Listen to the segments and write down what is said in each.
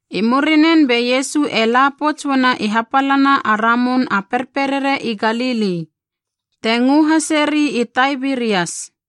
I murinen be Iesu e la pouts uana i hapalana a Ramun a Perperere i Galili, te ngö haseri i Taibirias.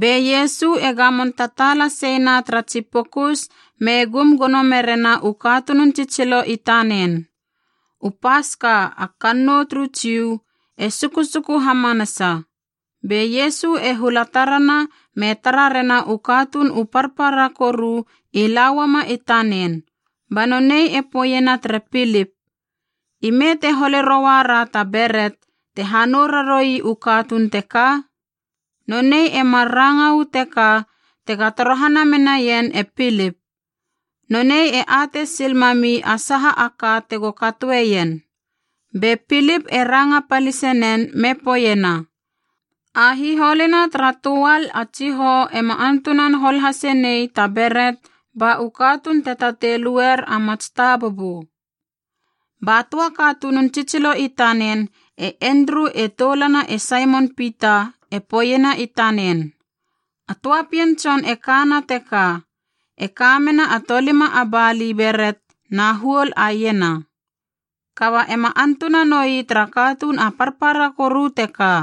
Be Iesu e gamon tataala seina tara tsi pokus me gum gono merena u katunun tsitsilo i tanen. U Paska, a kannou turu Jiu, e sukusuku hamanasa. Be Iesu e hula tarana me tara rena u katuun u parpara koru i la uama i tanen, ba nonei e poeiena tere Pilip, “Ime te hole rouara ta beret te hanou raroui u katuun teka?” Nonei e mar ranga uu teka tega torohana menaien e Pilip. Nonei e atei sil mami a saha a ka tego katoeien. Be Pilip e ranga palise nen me poeiena, “A hiholuna tara töal a tsihoua ema antunan hol hase nei ta beret ba u katuun te tatei luer a mats tabubu.” Ba töa katunun tsitsilo i tanen, e Endru e toulana e Saimon Pita, e poeiena i tanen, “A töa pien tson e kana teka, e ka mena a tolima a bali beret na huol a iena. Kaba ema antuna noi tara katuun a parpara koru teka.”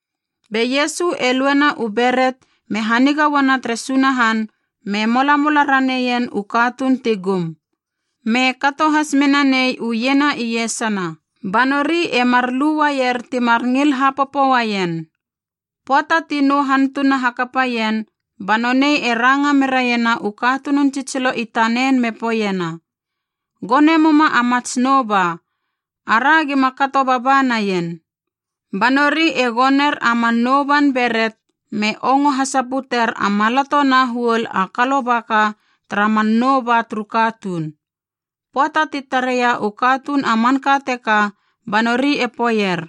Be Iesu e luena u beret me haniga uana tere Sunahan me molamola raneien u katuun ti gum. Me kato has menanei u iena iesana, ba nori e mar luaier timar ngil hapopo uaien. Pöata ti nou hantuna hakapaien, ba nonei e ranga meraiena u katunun tsitsilo i tanen me poeiena, “Gone muma a mats nouba, ara gima kato baba naien.” Ba nori e goner a man nouban beret, me ongo hasaputer a maloto na huol a kalobaka tara man nou ba turu katuun. Pöata ti tareia u katuun a manka teka ba nori e poeier,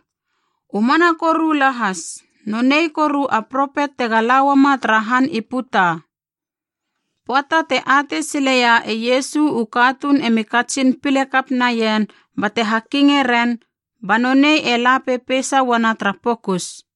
“U mana koru lahas, nonei koru a propet tega la uama tara han i puta.” Pöata te atei sileia e Iesu u katuun emi katsin pile kap naien bate hakinge ren, ba nonei e la pepeisa uana tara pokus.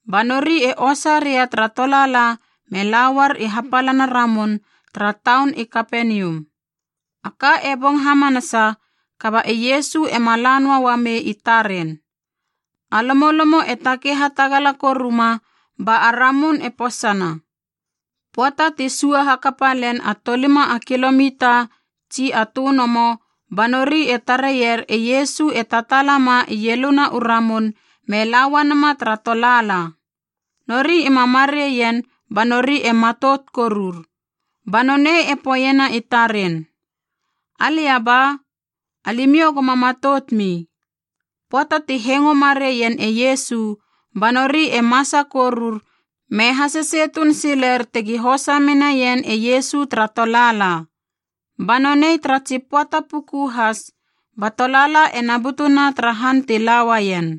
Ba nori e osa ria tara tolaala me lauar i hapalana ramun tara taun i Kapenium. A ka e bong hamanasa kaba e Iesu ema la noa ua mei i taren. A lomolomo e takei hatagala koru ma ba a ramun e posana. Pöata ti sua hakape len a tolima a kilomita tsi a tönomo ba nori e tareier e Iesu e tataala ma ieluna u ramun me la uanama tara tolaala. Nori ima marei ien ba nori e matout korur. Ba nonei e poeiena i taren, “Alia ba, alimiou goma matoutmi.” Pöata ti hengo marei ien e Iesu ba nori e masa korur me hasesei tuun siler tegi hosa menaien e Iesu tara tolaala. Ba nonei tara tsi pöata puku has ba tolaala ena butuna tara han ti la uaien.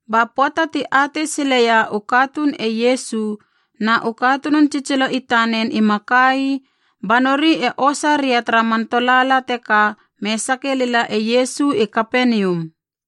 Ba pöata ti atei sileia u katuun e Iesu na u katunun tsitsilo i tanen ima ka ii, ba nori e osa ria tara man tolaala teka me sake lila e Iesu i Kapenium.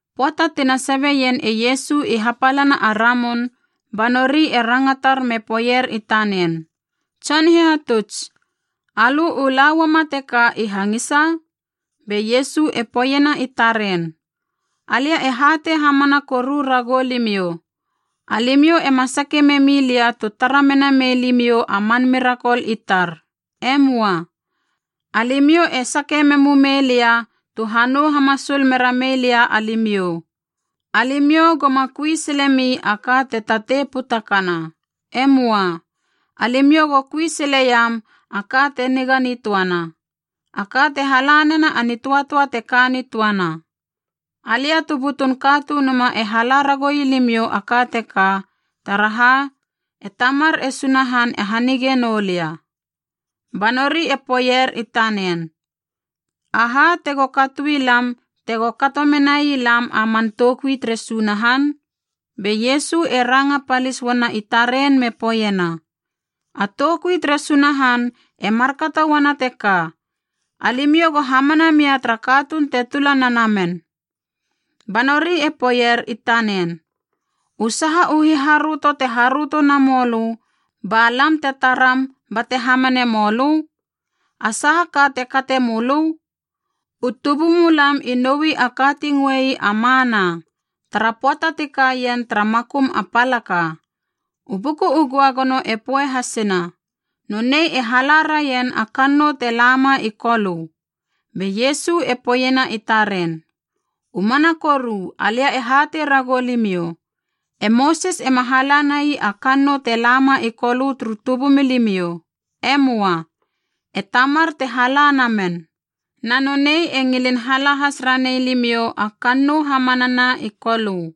Pöata tina sabieien e Iesu i hapalana a ramun, ba nori e rangatar me poeier i tanen, “Tson Hihatuts, alö u la uama teka i hangisa?” Be Iesu e poeiena i taren, “Alia e hatei hamana koru ragou limiou, alimiou ema sake memi lia tu tara mena mei limiou a man mirakol i tar. E möa, alimiou e sake memu mei lia tu hanou hamasul mera mei lia alimiou. Alimiou goma kui silemi a ka te tatei putakana. E möa. Alimiou go kui sileiam a ka te niga nitöana, a ka te hala nena a nitöatöa te ka nitöana. Alia tu butun Katunuma e hala ragoui limiou a ka teka, taraha e Tamar e Sunahan e hanige noulia.” Ba nori e poeier i tanen, “Aha tego katoi lam tego kato menai lam a man toukui tere Sunahan?” Be Iesu e ranga palis uana i taren me poeiena, “A toukui tere Sunahan e markato uana teka, alimiou go hamana mia tara katuun te tula na men.” Ba nori e poeier i tanen, “U saha u hiharöto te haröto namoulö ba lam te taram bate hamane mölö? A saha ka te kate mölö? U tubumulam i noui a ka ti ngöei a Mana, tara pöata ti kaien tara makum a palaka. U Buku u Göagono e poe hasena, ‘Nonei e hala raien a kannou te lama i Kolö.’” Be Iesu e poeiena i taren, “U mana koru alia e hatei ragou limiou, e Mosis ema hala nai a kannou te lama i Kolö turu tubumilimiou. E möa. E Tamar te hala na men. Na nonei e ngilin hala has ranei limiou a kannou hamanana i Kolö.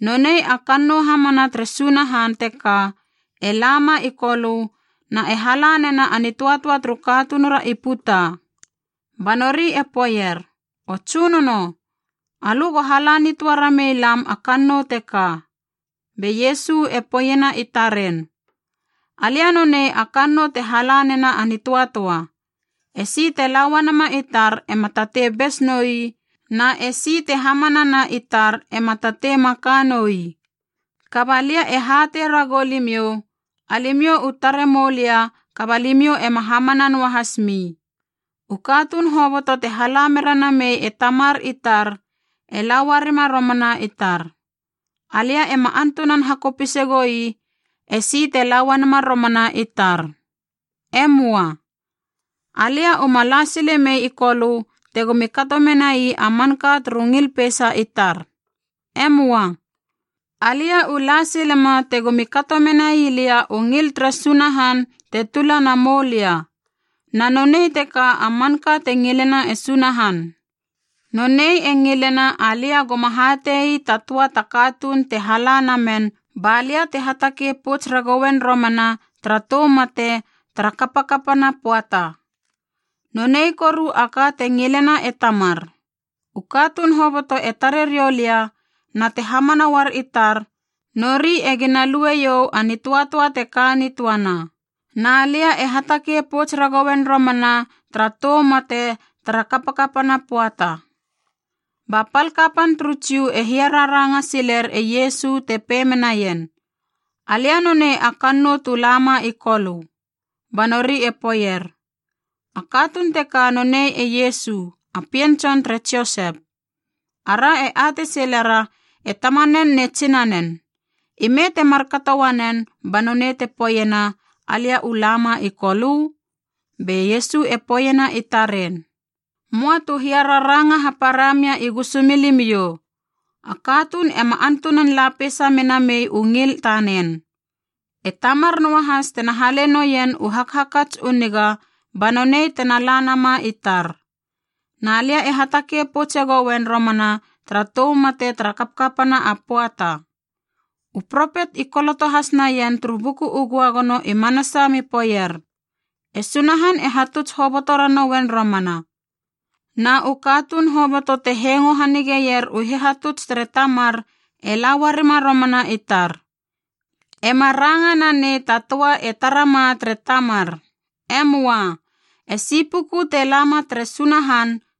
Nonei a kannou hamana tere Sunahan teka e lama i Kolö na e hala nena a nitöatöa turu katunura i puta.” Ba nori e poeier, “O Tsunono, alö go hala nitöa ramei lam a kannou teka.” Be Iesu e poeiena i taren, “Alia nonei a kannou te hala nena a nitöatöa. E si te la uanama i tar ema tatei bes noi na esi te hamanana i tar ema tatei maka noi. Kaba lia e hatei ragou limiou, alimiou u tare moulia kaba limiou ema hamana noahas mi. U katuun hoboto te hala mera namei e Tamar i tar e la uarima romana i tar. Alia ema antunan hakopise goi esi te la uanama romana i tar. E möa. Alia uma la sile mei i Kolö tegomi kato menai a manka turu ngil peisa i tar. E möa. Alia u la silema tegomi kato menai lia u ngil tere Sunahan te tula na moulia. Na nonei teka a manka te ngilena e Sunahan: nonei e ngilena alia goma hatie ii ta töa ta katuun te hala na men ba lia te hatakei pouts ragoen romana tara tou mate tara kapakapana pöata. Nonei koru a ka te ngilena e Tamar, u katuun hoboto te tare riou lia na te hamana uar i tar, nori egina lueiou a nitöatöa te ka nitöana. Na lia e hatakei pouts ragoen romana tara tou mate tara kapakapana pöata.” Ba pal kapan turu Jiu e hiararanga siler e Iesu te pei menaien, “Alia nonei a kannou tu lama i Kolö.” Ba nori e poeier, “A katuun teka nonei e Iesu, a pien tson tere Josep. Ara e atei silera e tamanen ne tsinanen. Ime te markato uanen ba nonei te poeiena, ‘Alia u lama i Kolö?’” Be Iesu e poeiena i taren, “Möa tu hiararanga hapara mia i gusumilimiou. A katuun ema antunan la peisa mena mei u ngil tanen, e Tamar noahas tena hale noien u hakhakats u niga ba nonei tena la nama i tar. Na lia e hatakei poutse goen romana tara tou mate tara kapakapana a pöata. U propetb i koloto has naien turu Buku u Göagono i manasa me poeier, ‘E Sunahan e hatuts hoboto ranoen romana.’ Na u katuun hoboto te hengo hanigeier u hihatuts tere Tamar e la uarima romana i tar. Ema ranga nanei ta töa e tarama tere Tamar. E möa. Esi puku te lama tere Sunahan,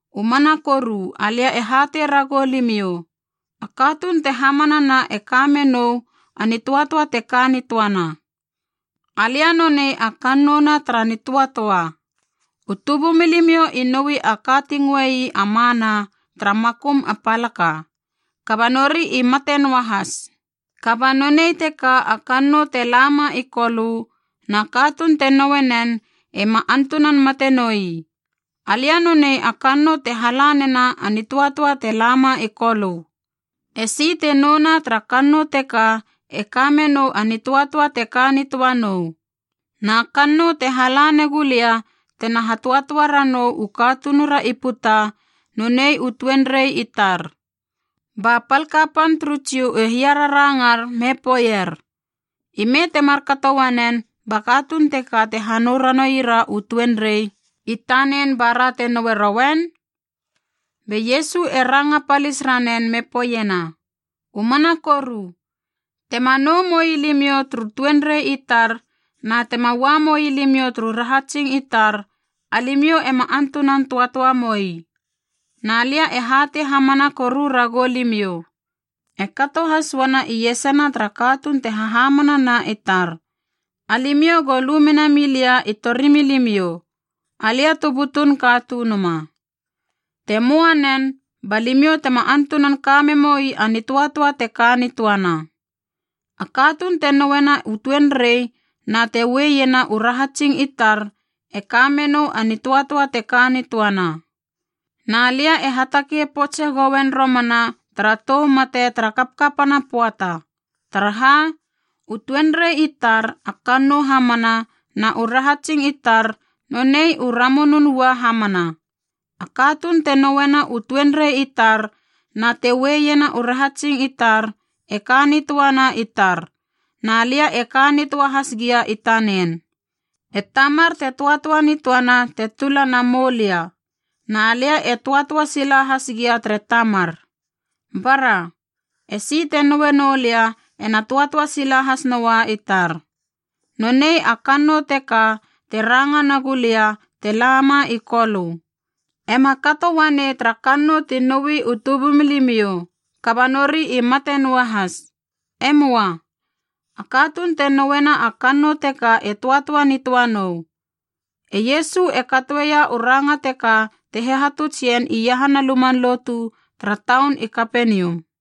“U mana koru alia e hatei ragou limiou, a katuun te hamanana e ka menou a nitöatöa te ka nitöana. Alia nonei a kannou na tara nitöatöa. U tubumilimiou i noui a ka ti ngöei a Mana tara makum a palaka. Kaba nori i mate noahas. Kaba nonei teka a kannou te lama i Kolö, na katuun te noue nen e ma antunan mate noi. Alia nonei a kannou te hala nena a nitöatöa te lama i Kolö. E si te nouna tara kannou teka e ka me nou a nitöatöa te ka nitöa nou. Na kannou te hala negu lia tena ha töatöa ranou u katunura i puta, nonei u tuenrei i tar.” Ba pal kapan turu Jiu e hiararangar me poeier, “Ime te markato uanen ba katuun teka te hanou ranoira u tuenrei i tanen bara te noue roen?” Be Iesu e ranga palis ranen me poeiena, “U mana koru, tema nou moilimiou turu tuenrei i tar na tema ua moilimiou turu rahatsing i tar alimiou ema antunan töatöa moi. Na lia e hatei hamana koru ragou limiou, e kato has uana iesana tara katuun te hahamana na i tar, alimiou go lu mena milia i torimilimiou, Alia tu butun Katunuma. Te möa nen, ba limiou tema antunan ka memoi a nitöatöa te ka nitöana. A katuun te nouena u tuenrei na te ue iena u rahatsing i tar e ka menou a nitöatöa te ka nitöana. Na lia e hatakei poutse goen romana tara tou mate tara kapakapana pöata. Taraha, u tuenrei i tar a kannou hamana na u rahatsing i tar nonei u ramunun ua hamana. A katuun te nouena u tuenrei i tar na te ue iena u rahatsing i tar e ka nitöana i tar, na lia e ka nitöa has gia i tanen. E Tamar te töatöa nitöana te tula na moulia. Na lia e töatöa sila has gia tere Tamar. Bara! Esi te noue noulia ena töatöa sila has noa i tar. Nonei a kannou teka te ranga nagula lia te lama i Kolö. Ema kato uanei tara kannou ti nouia u tubumilimiou, kaba nori i mate noahas. E möa. A katuun te nouena a kannou teka e töatöa nitöa nou.” E Iesu e katoeia u ranga teka te hihatuts ien iahana luman lotu tara taun i Kapenium.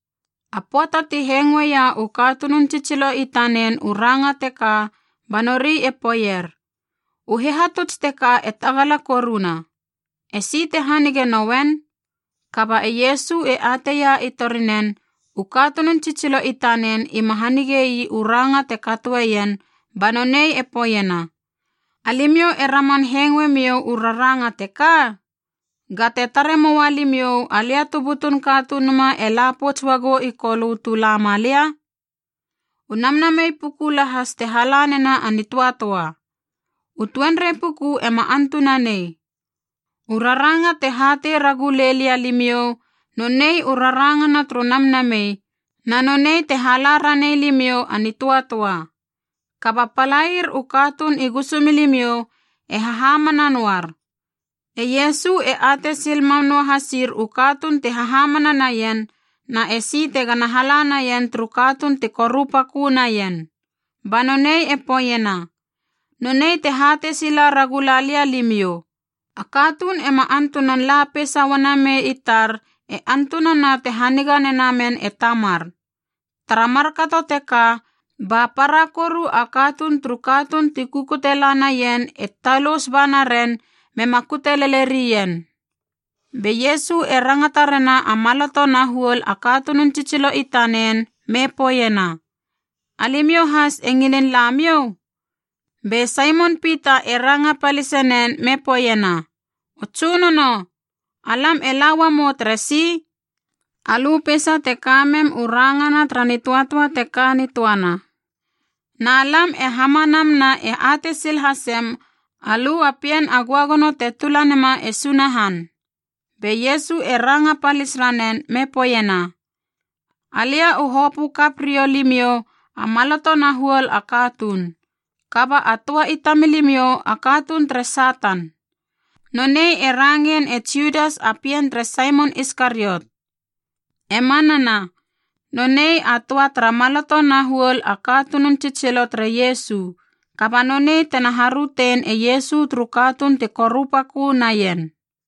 A pöata ti hengoeia u katunun tsitsilo i tanen u ranga teka ba nori e poeier, “U hihatuts teka e tagala koruna. Esi te hanige noen?” Kaba e Iesu e ateia i tori nen, u katunun tsitsilo i tanen ima hanigei u ranga te katoeien, ba nonei e poeiena, “Alimiou e raman hengoe miou u raranga teka? Ga te tare moua limiou, Alia tu butun Katunuma e la pouts uagou i Kolö tu lama lia? U Namnamei puku lahas te hala nena a nitöatöa. U tuenrei puku ema antunanei. U raranga te hatei ragu lei lia limiou, nonei u rarangana turu namnamei, na nonei te hala ranei limiou a nitöatöa. Kaba palair u katuun i gusumilimiou e hahamana noar.” E Iesu e atei sil mam noa hasir u katuun ti hahamana naien, na esi tegana hala naien turu katuun ti korupakö naien. Ba nonei e poeiena, “Nonei te hatei sila ragula lia limiou, a katuun ema antunan la peisa ua namei i tar e antunana te haniga nena men e Tamar.” Tara markato teka ba para koru a katuun turu katuun ti kukute la naien e talous ba naren mema kute lele rien. Be Iesu e rangata rena a maloto na huol a katunun tsitsilo i tanen me poeiena, “Alimiou has e ngilin la miou?” Be Saimon Pita e ranga palise nen me poeiena, “O Tsunono, alam e la uamou teresi? Alö peisa te ka mem u rangana tara nitöatöa te ka nitöana. Na lam e hamanam na e atei sil hasem alö a Pien a Göagono te tula nema e Sunahan.” Be Iesu e ranga palis ranen me poeiena, “Alia u hopö kap riou limiou a maloto na huol a katuun. Kaba a töa i tamilimiou a katuun tere Satan.” Nonei e rangein e Judas a pien tere Saimon Iskariot. E manana, nonei a töa tara maloto na huol a katunun tsitsilo tere Iesu, kaba nonei tena harötein e Iesu turu katuun ti korupakö naien.